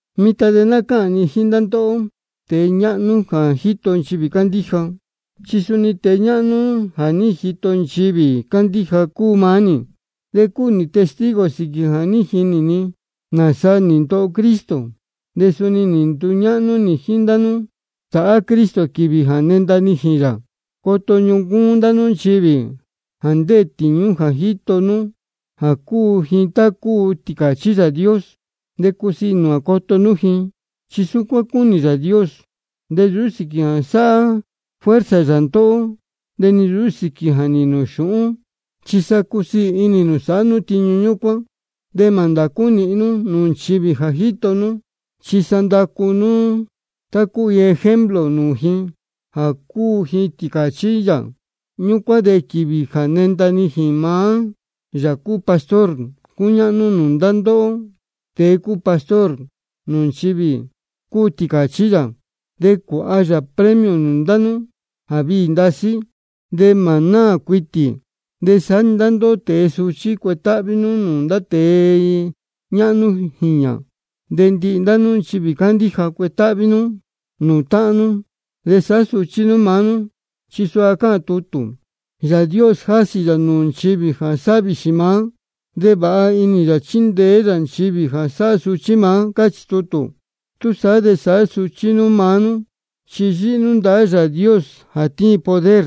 Mitan de ná cáhān ni jíín ndá ndóhó tēe ñáhnú jā jíto nchivī cándíja, chi suni tēe ñáhnú jā jíto nchivī cándíja cúu maá nī. De cúu nī testigo sīquī jā ní jinī ni nāsa nī ndoho Cristo. De suni nduñáhnú nī jíín ndá nú sāhá Cristo quīvī jā nenda nijīn yā. Coto ñuncúún nú ndá nchivī jā ndéē tīñú nú jā jíto nú, jā cúu ji tá cúu tīcāchí Yāā Dios. De cusiī inī nū jā coto nú ji, chi súcuán cúnī Yāā Dios. De nsūú sīquī jā sāhá fuerza yā ndóhó, de ni nsūú sīquī jā nīhīn nū xūhún, chi sa cusiī inī nū sāhá nú tiñu ñúcuán. De mā ndācú nīhin ndá nú nūū nchivī jā jíto nú, chi sa nducú nú cuu nú iin ejemplo nūū ji jā cúu ji tīcāchí yā. Ñúcuán de quīvī jā nenda nijīn maá Yāā cúu Pastor cúñáhnú nūū ndá ndóhó tēe cúu pastor nūū nchivī cúu tīcāchí yā, de cuāha yā premio nūū ndá nú jā viī ndasí de mā náā cuitī. De saá-ni ndá ndóhó tēe suchí, cuetáhví nú nūū ndá tēe ñáhnú jīñā. De ndihi ndá nú nchivī cándíja, cuetáhví nú nūū táhán nú, de sāhá suchí nú maá nú. Chi suha cáhān tutū: Yāā Dios jásī yā nūū nchivī jā sáhá vīxī maá, de vāha inī yā chíndeé yā nchivī jā sáhá suchí maá. Cáchī tutū. Túsaá de sāhá suchí nú maá nú, chi yíhí nú ndahá Yāā Dios jā tíin poder.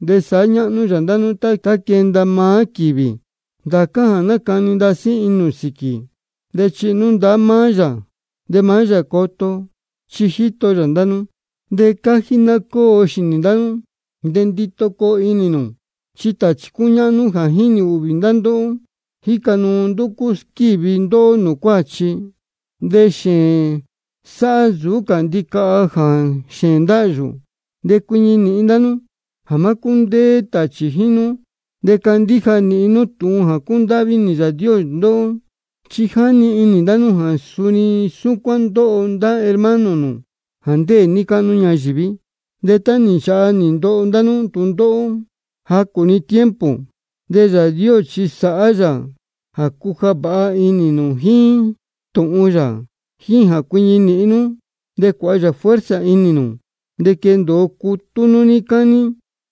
De sāhá ñáhnú yā ndá nú tá quenda maá quīvī. Ndācá jā nácani ndasí inī nū sīquī, de chihi nú ndahá maá yā de maá yā coto, chi jíto yā ndá nú. De cájí ná cóo xīnī ndá nú de ndito coo inī nū. Chi tāchī cúñáhnú jā jínī ūhvī ndá ndóhó, jíca nuu ndúcú squívi ndóhó nūū cuáchi. De xēēn cā sáhá nsūú cā ndicaha jā xēēn ndáhyū. De cuiñi nīhin ndá nú jā má cúndéé tāchī jíín nú, de candíja nīhin nú tūhun jā cúndáhví inī Yāā Dios ndóhó. Chi jínī ndá nú jā suni súcuán ndóho ndá hermano nū jā ndéē níí cáhnú ñayīví. De tá nī nchāha nī ndoho ndá nú tūndóhó jacū-ni tiempo, de Yāā Dios chi sāhá yā jā cuja vāha inī nū jíín tūhun yā, jíín jā cuiñi nīhin nú, de cuāha yā fuerza inī nū, de quendōo cutú nú níí cání.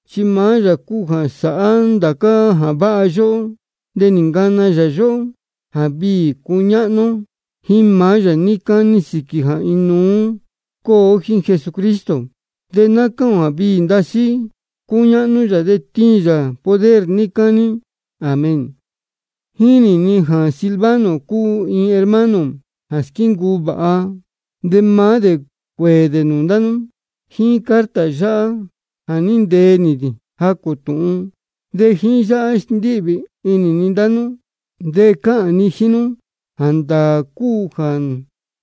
Chi maá yā cúu jā sáhá ndācá jā váha yóhó, de nī ncana yā yóhó jā viī cuñáhnú ó jíín yā níí cání sīquī jā inuú cúu ó jíín Jesucristo. De ná cáhān ō jā viī ndasí cúñáhnú yā, de tíin yā poder níí cání. Amén. Jínī ni jā Silvano cúu iin hermano jā squíncuu vāha. De maá dē cuēē nūū ndá nú jíín carta yáhá jā ní ntee nī jacū tūhun. De jíín yáhá sndíhvī inī ni ndá nú, de cáhān ni jíín nú jā ndáā cúu jā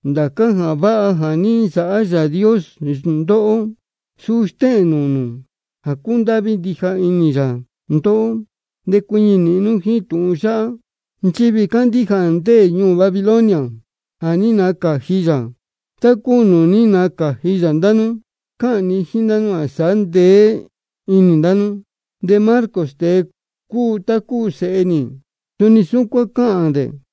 ndācá jā váha jā ní nsāhá Yāā Dios ndóhó, suu stéhēn nūū nū jā cúndáhví ndija inī yā ndóhó. De cuiñi nīhin nú jíín tūhun yáhá. Nchivī cándíja jā ndéē ñuū Babilonia, jā ní nacāji yā tá cúu nūū ní nacāji yā ndá nú, cáhān ndá ji jā sāhá ndeé inī ndá nú. De Marcos, tēe cúu tá cúu sēhe nī, suni súcuán cáhān dē.